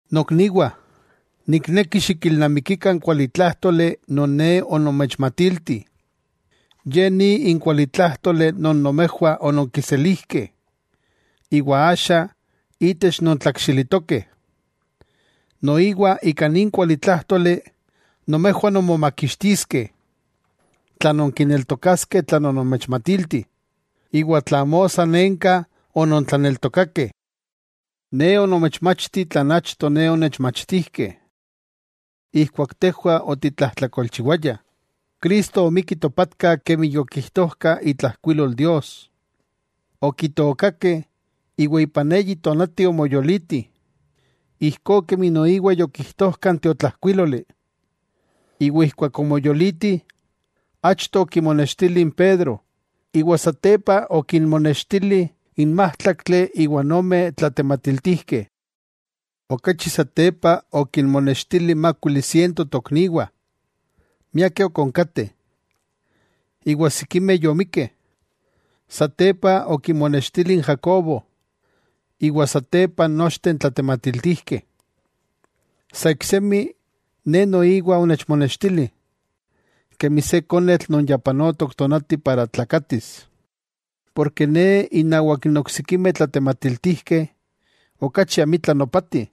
Nokniwah, nikneki xikilnamikikah n kualitlájtoli non ne onomechmatilti. Ye ni n kualitlájtoli non nomejwah ononkiselijkeh, iwa axa itech nontlakxilitokeh. Noiwa ika nin kualitlájtoli nomejwah nonmomakixtiskeh, tla nonkineltokaskeh tlan onomechmatilti, iwa tla amo sanenka onontlaneltokakeh. Ne onomechmachti tlan achto ne onechmachtijkeh. Ijkuak tejwah otitlajtlakolchiwayah, Cristo omikki topatka kemi yokijtojka itlajkuilol Dios. Okitookakeh, iwa ipan eyi tonati omoyoliti, ijkó kemi noiwa yokijtojka n tiotlajkuíloli, iwa ijkuak omoyoliti, achto okimonextili n Pedro, iwa satepa okinmonextili n májtlaktli iwa n ome tlatematiltijkeh. Okachi satepa okinmonextili mákuili siento tokniwah. Miakeh ok onkateh, iwa sikimeh yomikkeh. Satepa okimonextili n Jacobo, iwa satepa nochteh n tlatematiltijkeh. Sa iksemi, ne noiwa onechmonextili, kemi se konetl non yopanok tonati para tlakatis. Porke ne innawak n oksikimeh tlatematiltijkeh okachi amitla nopati,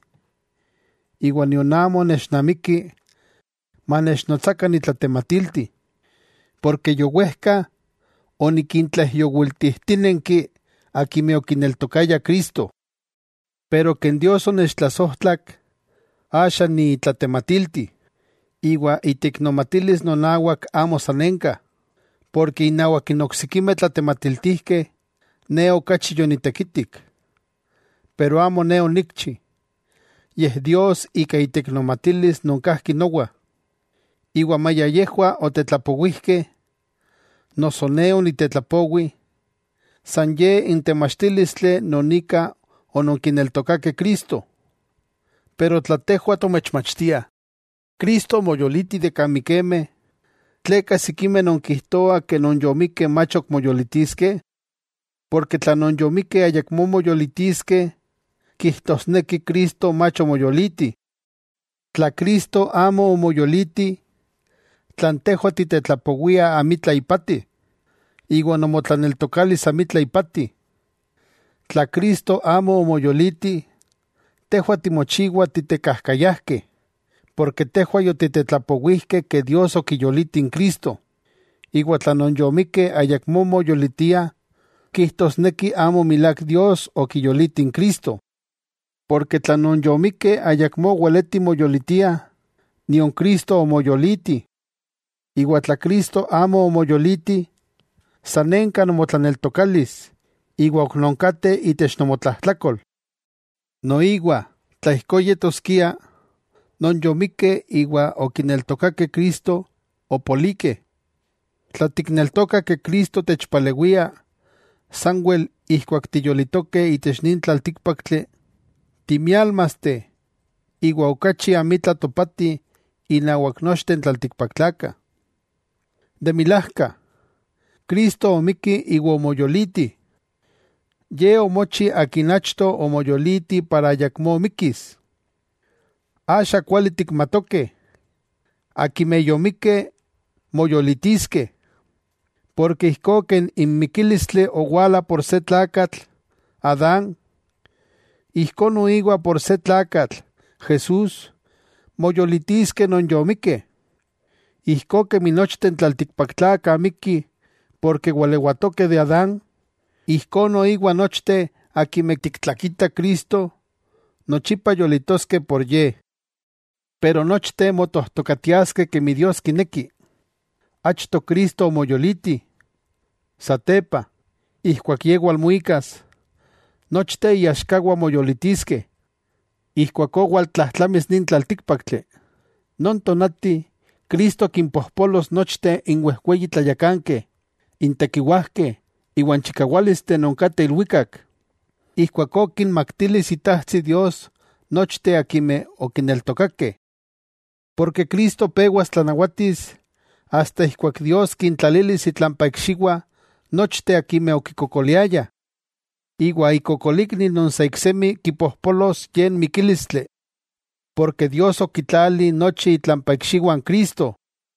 iwa nion amo nechnamiki manechnotsakah nitlatematilti, porke yowejka onikintlaijyowiltijtínenki akimeh okineltokayah Cristo. Pero ken Dios onechtlasojtlak axa ni itlatematilti. Iwa iteiknomatilis nonawak amo sanenka, porke innawak n oksikimeh tlatematiltijkeh, ne okachi yonitekitik. Pero amo ne onikchi, yej Dios ika iteiknomatilis non kajki nowa. Iwa maya yejwah otetlapowijkeh, noso ne onitetlapowi, san ye n temachtílistli non ika ononkineltokakeh Cristo. Pero tla tejwah tomechmachtiah Cristo omoyoliti de kan mikemeh, ¿tleka sikimeh nonkijtoah ke non yomikkeh mach ok moyolitiskeh? Porke tla non yomikkeh ayakmó moyolitiskeh, kijtosneki Cristo mach omoyoliti. Tla Cristo amo omoyoliti, tlan tejwah titetlapowiah amitla ipati, iwa nomotlaneltokalis amitla ipati. Tla Cristo amo omoyoliti, tejwah timochiwah titekajkayajkeh, porke tejwah yotitetlapowijkeh Dios okiyoliti n Cristo, iwa tla non yomikkeh ayakmó moyolitiah kijtosneki amo milák Dios okiyoliti n Cristo. Porke tla non yomikkeh ayakmó weletih moyolitiah, nion Cristo omoyoliti. Iwa tla Cristo amo omoyoliti, sanenka nomotlaneltokalis iwa ok nonkateh itech nomotlajtlakol. Noiwa tla ijkó yetoskia, non yomikkeh iwa okineltokakeh Cristo, opolikeh. Tla tikneltokah ke Cristo techpalewia sanwel ijkuak tiyolitokeh itech nin tlaltíkpaktli, timiálmasteh iwa okachi amitla topatih innawak nochteh n tlaltikpaktlakah. De milajka, ¡Cristo omikki iwa omoyoliti! Ye omochi Akin achto omoyoliti para ayakmó mikkis. Axa kuali tikmatokeh, akimeh yomikkeh, moyolitiskeh. Porke ijkó yej n mikílistli owala por se tlakatl (Adán), ijkó noiwa por se tlakatl (Jesús) moyolitiskeh non yomikkeh. Ijkó kemi nochteh n tlaltikpaktlakah mikkih porke walewatokeh de Adán, ijkó noiwa nochteh akimeh tiktlakitah Cristo, nochipa yolitoskeh por Ye. Pero nochteh motojtokatiaskeh kemi Dios kineki: Achto Cristo omoyoliti, satepa, ijkuak Ye walmuikas, nochteh iaxkawah, moyolitiskeh. Ijkuakó waltlajtlamis nin tlaltíkpaktli. Non tonati Cristo kimpojpolos nochteh n wejweyi tlayakankeh, n tekiwajkeh iwan chikawálisteh non kateh ilwikak. Ijkuakó kinmaktilis Itajtsi Dios nochteh akimeh okineltokakeh. Porke Cristo pewas tlanawatis asta ijkuak Dios kintlalilis itlampa ikxiwah nochteh akimeh okikokoliayah. Iwa ikokolikni non sa iksemi kipojpolos ye n mikílistli. Porke Dios okitlali nochi itlampa ikxiwah n Cristo.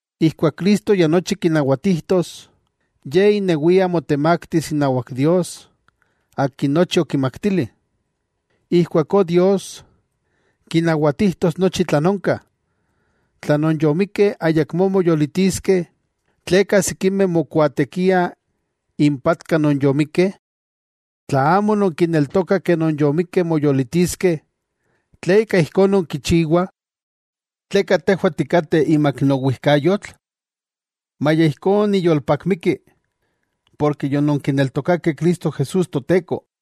Ijkuak Cristo ya nochi kinawatijtos, Ye inewia motemaktis inawak Dios Akin nochi okimaktili. Ijkuakó Dios, kinawatijtos nochi tlan onka. Tla non yomikkeh ayakmó moyolitiskeh, ¿tleka sikimeh mokuaatekiah impatka non yomikkeh? Tla amo nonkineltokah ke non yomikkeh moyolitiskeh ¿tleka ijkó nonkichiwah? ¿Tleka tejwah tikateh imak n owijkayotl? Maya ijkó, niyolpakmiki porke yononkineltokakeh Cristo Jesús Toteko.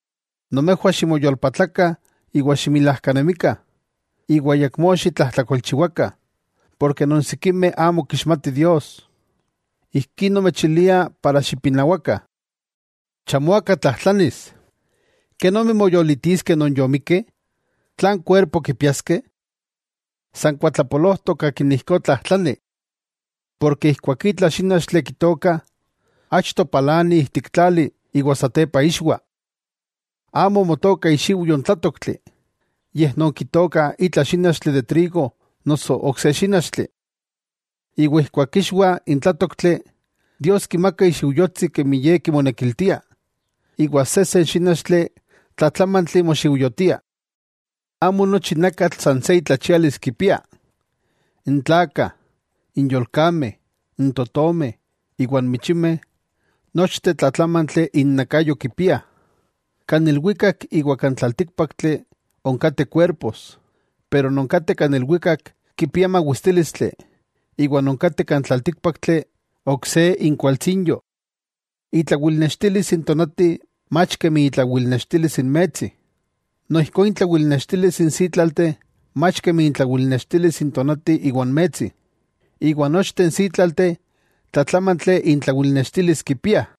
Nomejwah ximoyolpatlakah iwa ximilajkanemikah, iwa ayakmó xitlajtlakolchiwakah, porke non sikimeh amo kixmati Dios. Ijkí nomechilia para xipinawakah. Chamo aka tlajtlanis: “¿Kenomi, moyolitiskeh non yomikkeh? ¿Tlan kuerpo kipiaskeh?” San kuatlapolojtok akin ijkó tlajtlani. Porke ijkuak itla xínachtli kitookah, achto palani ijtik tlali iwa satepa ixwa. Amo motooka ixiujyo n tlátoktli, yej nonkitookah itla xínachtli de trigo noso ok se xínachtli. Iwa ijkuak ixwa n tlátoktli, Dios kimaka ixiujyotsi kemi Ye kimonekiltia, iwa sejsen xínachtli tlatlámantli moxiujyotia. Amo nochi nakatl san se intlachialis kipiah: n tlakah, n yolkameh, n totomeh, iwa n michimeh, nochteh tlatlámantli innakayo kipiah. Kan ilwikak iwa kan tlaltíkpaktli onkateh kuerpos, pero non kateh kan ilwikak kipiah mawistílistli iwa non kateh kan tlaltíkpaktli ok se inkualtsinyo. Itlawilnextilis n tonati, mach kemi itlawilnextilis n metsi, noijkó intlawilnextilis n sítlalteh mach kemi itlawilnextilis n tonati iwa n metsi, iwa nochteh n sítlalteh tlatlámantli intlawilnextilis kipiah.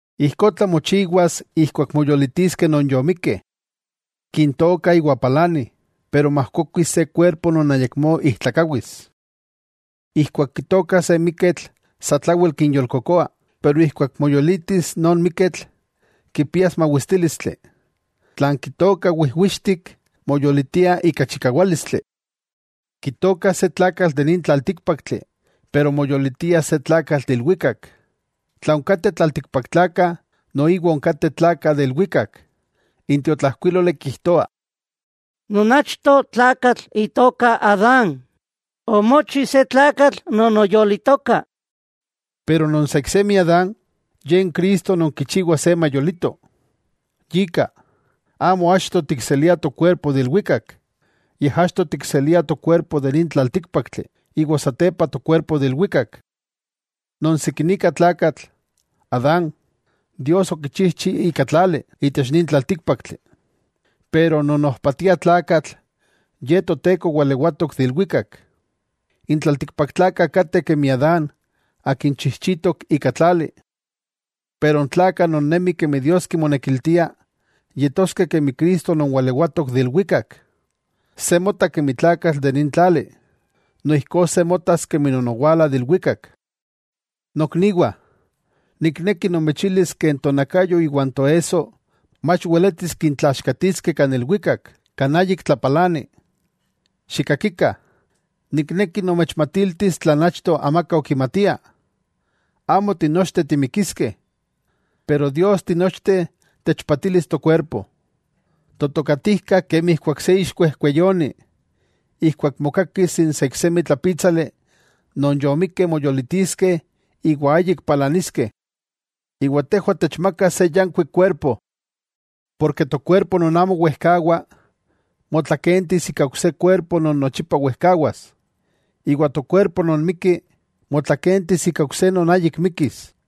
Ijkó tlamochiwas ijkuak moyolitiskeh non yomikkeh. Kintookah iwa palani, pero majkokuis se kuerpo non ayakmó ijtlakawis. Ijkuak kitookah se miketl satlawel kinyolkokoah, pero ijkuak moyolitis non miketl, kipias mawistílistli. Tlan kitookah wijwixtik, moyolitia ika chikawálistli. Kitookah se tlakatl de nin tlaltíkpaktli, pero moyolitia se tlakatl de ilwikak. Tla onkateh tlaltikpaktlakah, noiwa onkateh tlakah de ilwikak. N tiotlajkuíloli kijtoa: Non achto tlakatl itoka Adán, omochi se tlakatl non oyolitoka. Pero non sa iksemi Adán, Ye n Cristo non kichiwa se mayolito. Yika, amo achto tikseliah tokuerpo de ilwikak, yej achto tikseliah tokuerpo de nin tlaltíkpaktli, iwa satepa tokuerpo de ilwikak. Non sikinika tlakatl, Adán, Dios okichijchi ika tlali, itech nin tlaltíkpaktli. Pero n ojpatiah tlakatl Ye Toteko walewatok de ilwikak. N tlaltikpaktlakah kateh kemi Adán akin chijchitok ika tlali. Pero n tlakah non nemih kemi Dios kimonekiltia, yetoskeh kemi Cristo non walewatok de ilwikak. Se mota kemi tlakatl de nin tlali, noijkó se motas kemi non owala de ilwikak. Nokniwah, nikneki nomechilis, tonakayo iwan toesso mach weletis kintlaxkatiliskeh kan ilwikak, kan ayik tlapalani. Xikakikah, nikneki nomechmatiltis tlan achto amaka okimatia: Amo tinochteh timikiskeh. Pero Dios tinochteh techpatilis tokuerpo. Totokatijkak, kemi ijkuak se ixkuejkueyoni, ijkuak mokakis n saiksemi tlapítsali non yomikkeh moyolitiskeh iwa ayik palaniskeh. Iwa tejwah techmakas se yankuik kuerpo. Porke tokuerpo non amo wejkawa, motlakentis ika ok se kuerpo non nochipa wejkawas. Iwa tokuerpo non mikki, motlakentis ika ok se non ayik mikkis.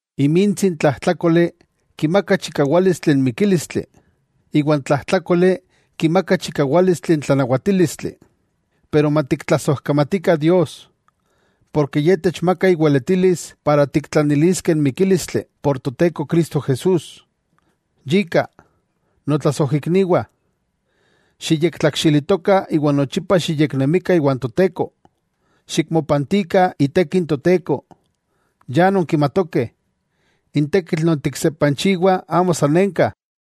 Imintsi n tlajtlákoli kimaka chikawálistli n mikílistli, iwa n tlajtlákoli kimaka chikawálistli n tlanawatílistli. Pero matiktlasojkamatikah Dios, porke Ye techmaka iweletilis para tiktlaniliskeh n mikílistli por Toteko Cristo Jesús. Yika, notlasojikniwah xiyektlakxilitokah iwa nochipa xiyeknemikah iwan Toteko, xikmopantikah iteki n Toteko. Ya nonkimatokeh, n tekitl non tiksepanchiwah, amo sanenka.